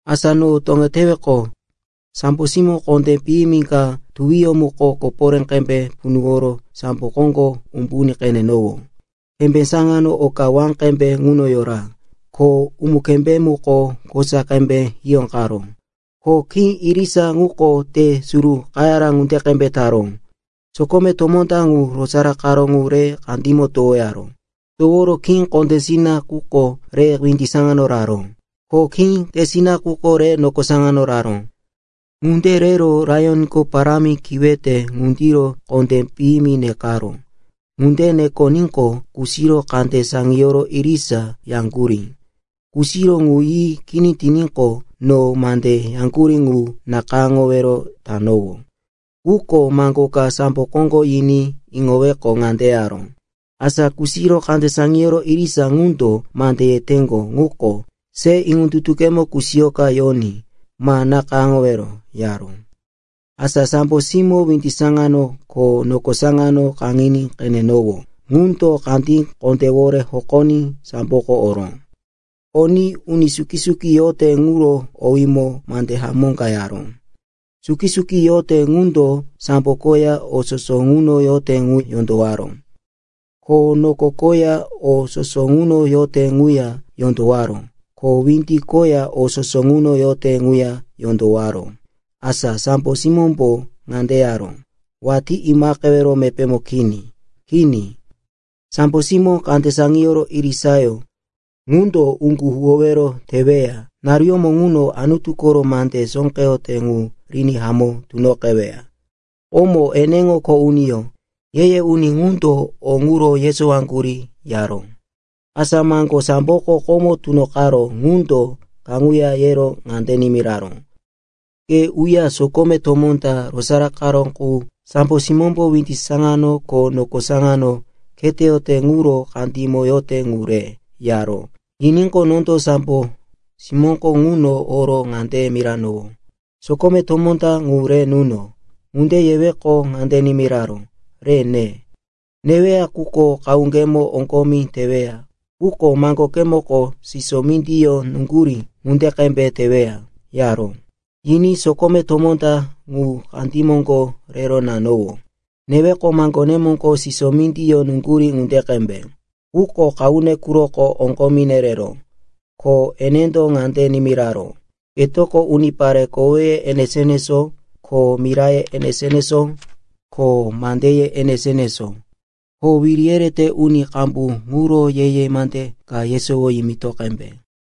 Asa no toŋeteweqo, sambo simó kondé piyimi ka tuwiyó muko koporé qembe punuworo sambo koŋgo umbuní qenenowó. Kembé saŋano oka wá qembe ŋuno yora, ko umu-kembé muko kosa qembe hiyóqaró, ko khí irisa ŋuko te suru qayara ŋunde qembe taró. Sokome tomó ta ŋu rosaraqaró ŋu re kandímo towoyaró. Toworo khí kondésina quko re windi saŋano raró, ko khí tesina quko re noko saŋano raró. Ŋunde rero laiyonko parámi kiwete ŋundiro kondé piyimi nekaró. Ŋunde nekoníqo, kusiro kande saŋiyoro irisa yaŋgurí. Kusiro ŋu yi kini tiníqo, no mande yaŋgurí ŋu nakayáŋowero tanowó. Quko maŋgo ka sambo koŋgo yiní iŋoweqo, ŋande yaró, “Asa kusiro kande saŋiyoro irisa ŋundo mande yeteŋgo ŋuko, se iŋondutukemo kusiyoka yoní. Ma nakayáŋowero,” yaró. Asa sambo simó windi saŋano ko noko saŋano kaŋiní qenenowó ŋundo kandí kondéwore hokoní samboko oró. Oní uni suki-suki yote ŋuro owímo mande hamó ka yaró. Suki-suki yote ŋundo sambo koya o soso ŋuno yote ŋu yondowaró, ko noko koya o soso ŋuno yote ŋuya yondowaró, ko windi koya o soso ŋuno yote ŋuya yondowaró. Asa sambo simómbo ŋande yaró, “Watí imaqewero mepémo kini. Kini, sambo simó kande saŋiyoro irisayó ŋundo uŋgu huwowero teweya naruyómo ŋuno Anutu koro mande sóqeyote ŋu riní hamó tunoqeweya. Komo eneŋo kho uniyó, ye-ye uni ŋundo o ŋuro yesowaŋgurí,” yaró. Asa maŋgo samboko komo tunoqaró ŋundo kaŋuya yero ŋande nimiraró, “Ke uya sokome tomó ta rosaraqaró qu sambo simómbo windi saŋano ko noko saŋano kheteyote quro kandímo yote ŋu re,” yaró. Yiníqo, nondo sambo simóko ŋuno oro ŋande miranowó, “Sokome tomó ta ŋu re nuno.” Ŋunde yeweqo, ŋande nimiraró, “Reya ne. Neweya quko qahuŋgemo oŋgomi teweya quko maŋgokemoko siso mindiyó nuŋgurí ŋunde qembe teweya,” yaró. Yiní sokome tomó ta ŋu kandí moŋgo rero nanowó. Neweqo, maŋgonemoko siso mindiyó nuŋgurí ŋunde qembe. Quko qahune quroko oŋgo nereró. Ko enendo ŋande nimiraró, “Ketoko unipare koweye enesó-enesó, ko miraye enesó-enesó, ko mandeye enesó-enesó, ko wiri yerete uni qambu ŋuro ye-ye mande ka yesowo yimito qembe.”